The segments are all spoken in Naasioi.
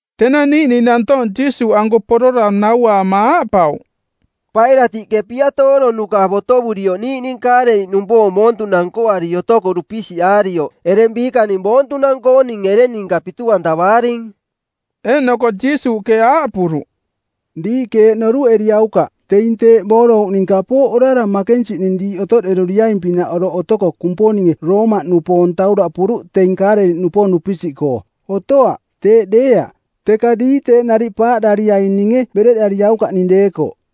Tenang niiꞌning nantoong Jiisuuꞌanko porora nauaama aaꞌpauꞌ, “Pailatiꞌke piatooronuka˜ botovurioꞌ niiꞌning Kaaleliꞌnupoong boontunang nkoari otoko dupisiꞌaarioꞌ ereng biikaning boontunang-kooning ereng ninka pitu-antavaaring.” Eeꞌnoko Jiisuuꞌke aaꞌpuruꞌ, “Diiꞌke eeꞌ noruꞌeriaukaꞌ: teing teeꞌ boorouꞌning kapooꞌ orara makensiꞌning diiꞌ otoꞌderuiaing-pinaꞌ oroꞌ otoko Kumponinge Roomaꞌnupoong tauraꞌpuruꞌ teing Kaaleliꞌnupoong dupisiꞌkoo. Otoaꞌ, teeꞌ deeaꞌ. Teka diiꞌ teeꞌ nariꞌ paaꞌdariaininge bereꞌdariaukaꞌning deekoꞌ.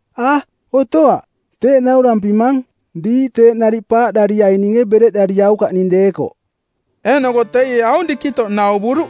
A, otoaꞌ, teeꞌ naurampimang. Diiꞌ teeꞌ nariꞌ paaꞌdariaininge bereꞌdariaukaꞌning deekoꞌ.” Eeꞌnoko teie aung dikitoꞌ nauvuruꞌ,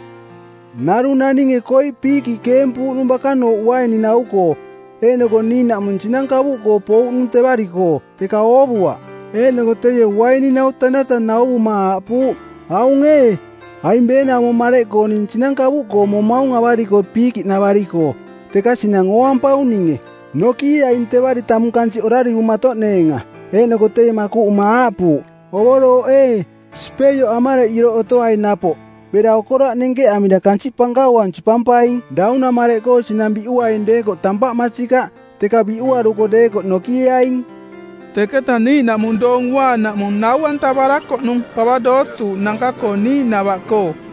“Narung naninge koiꞌ piikiꞌ keempuuꞌnung bakanooꞌ uaininau-koo, eeꞌnoko niiꞌnaꞌmung sinang kavuꞌkoo pouꞌnung tevari-koo, teka oovuaꞌ. Eeꞌnoko teie uaininau tanata nauvuma aaꞌpuuꞌ, ‘Aung ee, aing beenaumo mareꞌkoo ning sinang kavuꞌkoo momaung avari-koo piikiꞌnavari-koo, teka sinang ooampaung ninge. Nokieaing tevari tamung kansiꞌ orarivumatoꞌneenga.’ Eeꞌnoko teie makuꞌuma aaꞌpuuꞌ, ‘Ovorooꞌ ee, sipeioꞌ amareꞌ iroꞌ otoai napoꞌ bera okoraꞌ nenkeꞌamira kansiꞌ pankauang sipampaing. Daunamareꞌkoo sinang biꞌuaing deekoꞌ tampaꞌ masikaꞌ, teka biꞌuaruko deekoꞌ nokieaing.’” Teketa niiꞌnaꞌmung Doong Uaanaꞌmung, nau-antavarakoꞌnung pava dootuuꞌnanka-koo niiꞌnava-koo.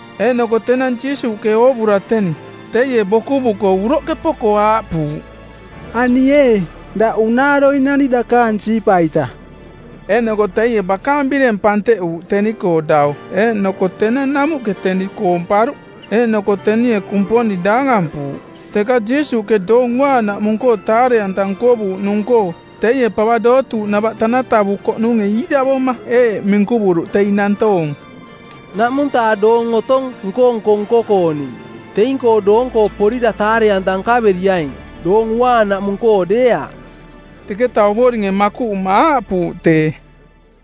Eeꞌnoko tenang Jiisuuꞌke oovura teni, teie bokuvuko uroꞌke poko aaꞌpuuꞌ, “Ani ee, daꞌ unaaroinani dakaang siipa-ita.” Eeꞌnoko teie bakaang bireng panteꞌuuꞌ teni-koo dau eeꞌnoko tenang namuꞌke teni koomparuꞌ. Eeꞌnoko tenie Kumponing daangampuuꞌ. Teka Jiisuuꞌke Doong Uaanaꞌmung-koo taare-anta nkovuuꞌnung-koo teie pava dootuuꞌnava tanatavukoꞌnunge iiravoma eeꞌ minkuvuruꞌ teing nantoong, “˜Naꞌmung-taa doong otong nko-nko nko-kooning. Teing-koo doonko porira taare-anta nkaveriaing, Doong Uaanaꞌmung-koo deeaꞌ.” Teketa Ovoringe makuꞌuma aaꞌpuuꞌ tee,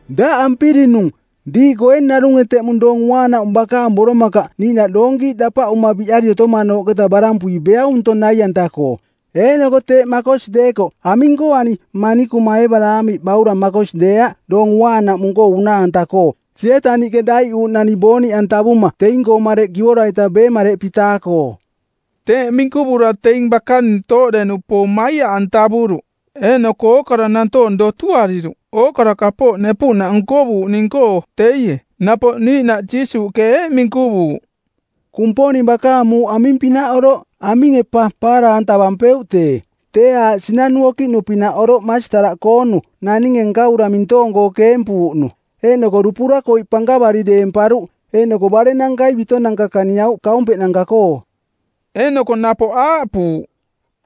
“Daꞌ ampirinung˜, diiꞌkoo ee narunge teꞌmung Doong Uaanaꞌmung bakaang boromakaꞌ niiꞌnaꞌ doonkiiꞌ dapaꞌuma biꞌari otomanooꞌketa barampui beaung ntong nai-anta-koo? Eeꞌnoko teeꞌ makosi deekoꞌ, aming-koo ani manikuma Eebaraamiꞌ baurang makosi deeaꞌ Doong Uaanaꞌmung-koo unaa-anta-koo, Sietaniꞌke daiꞌuuꞌnani booniꞌantavuma teing-koo mareꞌ kivora-ita ˜beemareꞌpi-taa-koo?” Teeꞌ minkuvura teing bakaning tooꞌde-nupoong maiaꞌantavuruꞌ eeꞌnoko ookara nantoong dotuariruꞌ ookara kapooꞌ nepuꞌnaꞌ nkovuuꞌning-koo teie. Napoꞌ niiꞌnaꞌ Jiisuuꞌke eeꞌ minkuvuuꞌ, “Kumponing bakaang muuꞌ aming-pinaꞌ oroꞌ? Aminge pa paara-antavampeuꞌ tee? Tee aaꞌ sinanu okiꞌnu-pinaꞌ oroꞌ masitaraꞌkoonu naninge nkavura mintoong-koo keempuuꞌnu, eeꞌnoko dupura koiꞌ pankavari deemparuꞌ, eeꞌnoko barennankai bitonanka kaniauꞌ kaumpeꞌnanka-koo.” Eeꞌnoko napoꞌ aaꞌpuuꞌ,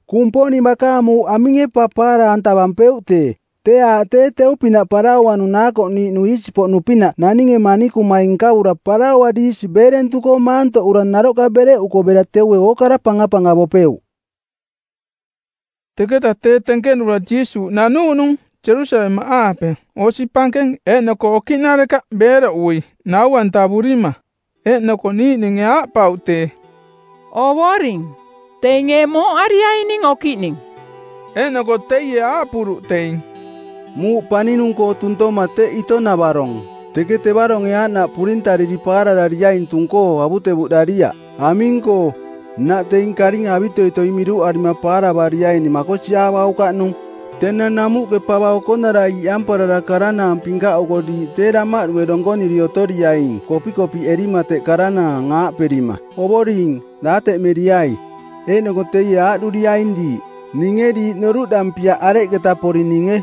“Kumponing bakaang muuꞌ aminge pa paara-antavampeuꞌ tee? Tee aaꞌ tee teu-pinaꞌ parauanu naakoꞌniiꞌnu iisi-poꞌnu-pinaꞌ naninge manikumai nkavura paraua diisi beerentuꞌkoo maantoꞌura naroꞌka bereꞌuko bera teue ookara pangapangavopeuꞌ.” Teketa tee tenkenura Jiisuuꞌ nanuuꞌnung Jerusalemaꞌaape osi pankeng eeꞌnoko okiꞌnarekaꞌ beeroꞌui nau-antavurima. Eeꞌnoko niiꞌninge aaꞌpauꞌ tee, “Ovoring, teing ee mooꞌariaining okiꞌning?” Eeꞌnoko teie aaꞌpuruꞌ teing, “Muuꞌ paninung-koo tuntoma teꞌ ito-navarong. Teke tevaronge aaꞌnaꞌ purintariri paararariaing tung-koo avutevuꞌdariaꞌ, aming-koo, nnaꞌ teing karinga avitoitoi miruꞌarima paaravariaining makosiaavaukaꞌnung. Tenang namuꞌke pava okonarai iꞌamparara karanaang pinkaꞌuko diiꞌ tee damaꞌdue donkoniri otoriaing kopikopiꞌerima teꞌ karanaang, aaꞌperima, ‘Ovoring, daateꞌmeriai.’ Eeꞌnoko teie aaꞌduriaing diiꞌ, ‘Ninge diiꞌ noruꞌdampiaꞌ areketa porininge.’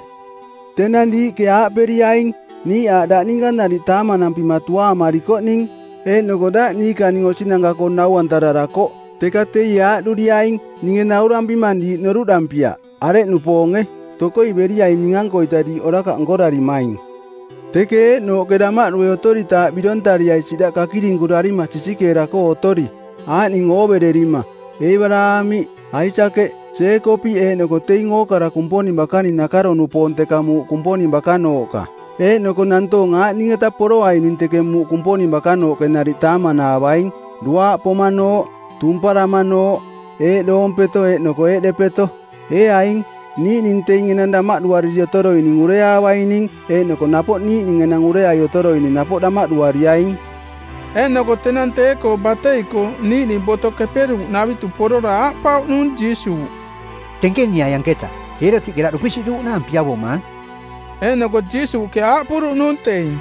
Tenang diiꞌke aaꞌperiaing, ‘Niiꞌ aaꞌ daꞌ ninka nariꞌ taamanampima tuaamarikoꞌning, eeꞌnoko daꞌ niikaning osinanka-koo nau-antararakoꞌ.’ Teka teie aaꞌduriaing, ‘Ninge naurampimang diiꞌ noruꞌdampiaꞌ, areꞌnupoonge. Tokoi beriaing ning-ankoita diiꞌ orakaꞌ nkorarimaing.’ “Teke eeꞌnooꞌke damaꞌdu otoritaaꞌ birontariai siꞌdaꞌ kakirinkurarima sisikeera-koo otori, aaꞌning oovererima: Eebaraamiꞌ, Aisakeꞌ, Jeekopiꞌ eeꞌnoko teing ookara Kumponing bakaning nakaro-nupoong teka muuꞌ Kumponing bakanooꞌka. Eeꞌnoko nantoong aaꞌning-eta poroaining teke muuꞌ Kumponing bakanooꞌke nariꞌ taamanaavaing: duaaꞌ pomanooꞌ, tumparamanooꞌ, eeꞌdoompeto eeꞌnoko eeꞌdepeto. Ee aing, niiꞌning teing enang damaꞌduariri otoroining ureaavaining eeꞌnoko napoꞌ niiꞌning enang ureai otoroining napoꞌ damaꞌduariaing.” Eeꞌnoko tenang tee-koo batei-koo niiꞌning Boto Keperuuꞌnavitu porora aaꞌpauꞌnung Jiisuuꞌ, “Tenkeniai anketa, Eerotiꞌke daꞌ dupisiꞌduuꞌnaang piavomaang.” Eeꞌnoko Jiisuuꞌke aaꞌpuruꞌnung teing,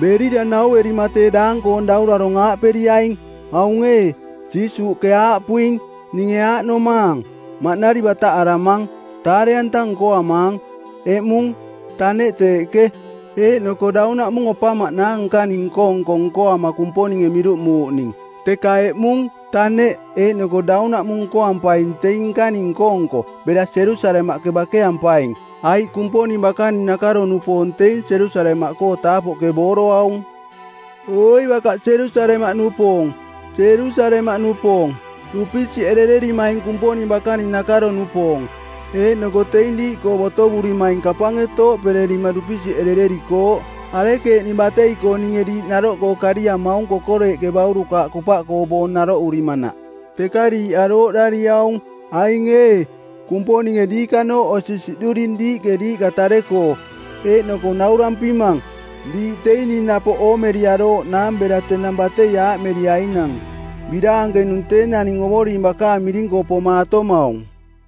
“Berira nauerima tee daang-koong daurarong aaꞌperiaing, ‘Aung ee, Jiisuuꞌke aaꞌpuing, “Ninge aaꞌnomaang: maꞌnari bataꞌaramang, taare-anta nkoamaang-eꞌmung, taneꞌ teeꞌke, eeꞌnoko daunaꞌmung opamaꞌnaang nkaning nko-nko nkoama Kumponinge miruꞌmuuꞌning. Teka eꞌmung, taneꞌ, eeꞌnoko daunaꞌmung nkoampaing teing nkaning nko-nko, bera Jerusalemaꞌke bakeampaing, aiꞌ Kumponing bakaning nakaro-nupoong teing Jerusalemaꞌkoo taapoꞌke booroaung.” ’ “Oi bakaꞌ Jerusalemaꞌnupoong, Jerusalemaꞌnupoong, dupisiꞌerererimaing Kumponing bakaning nakaro-nupoong, eeꞌnoko teing diiꞌkoo botovurimaing kapange tooꞌpererima dupisiꞌerererikooꞌ, arekeeꞌning batei-koo ninge diiꞌ naroꞌkoo kariamaung kokoreeꞌke baurukaaꞌ kupaꞌkoo boong naroꞌurimanaꞌ, teka diiꞌ arooꞌdariaung. Aing ee, Kumponinge diikanooꞌ osi siꞌduring diiꞌke diiꞌka tare-koo. Eeꞌnoko naurampimang, diiꞌ teing ning napoꞌ oomeriarooꞌnaang bera tenang batei aaꞌmeriainang, ‘Biraankenung tee naning Ovoring bakaang miring-koo pomaatomaung.’”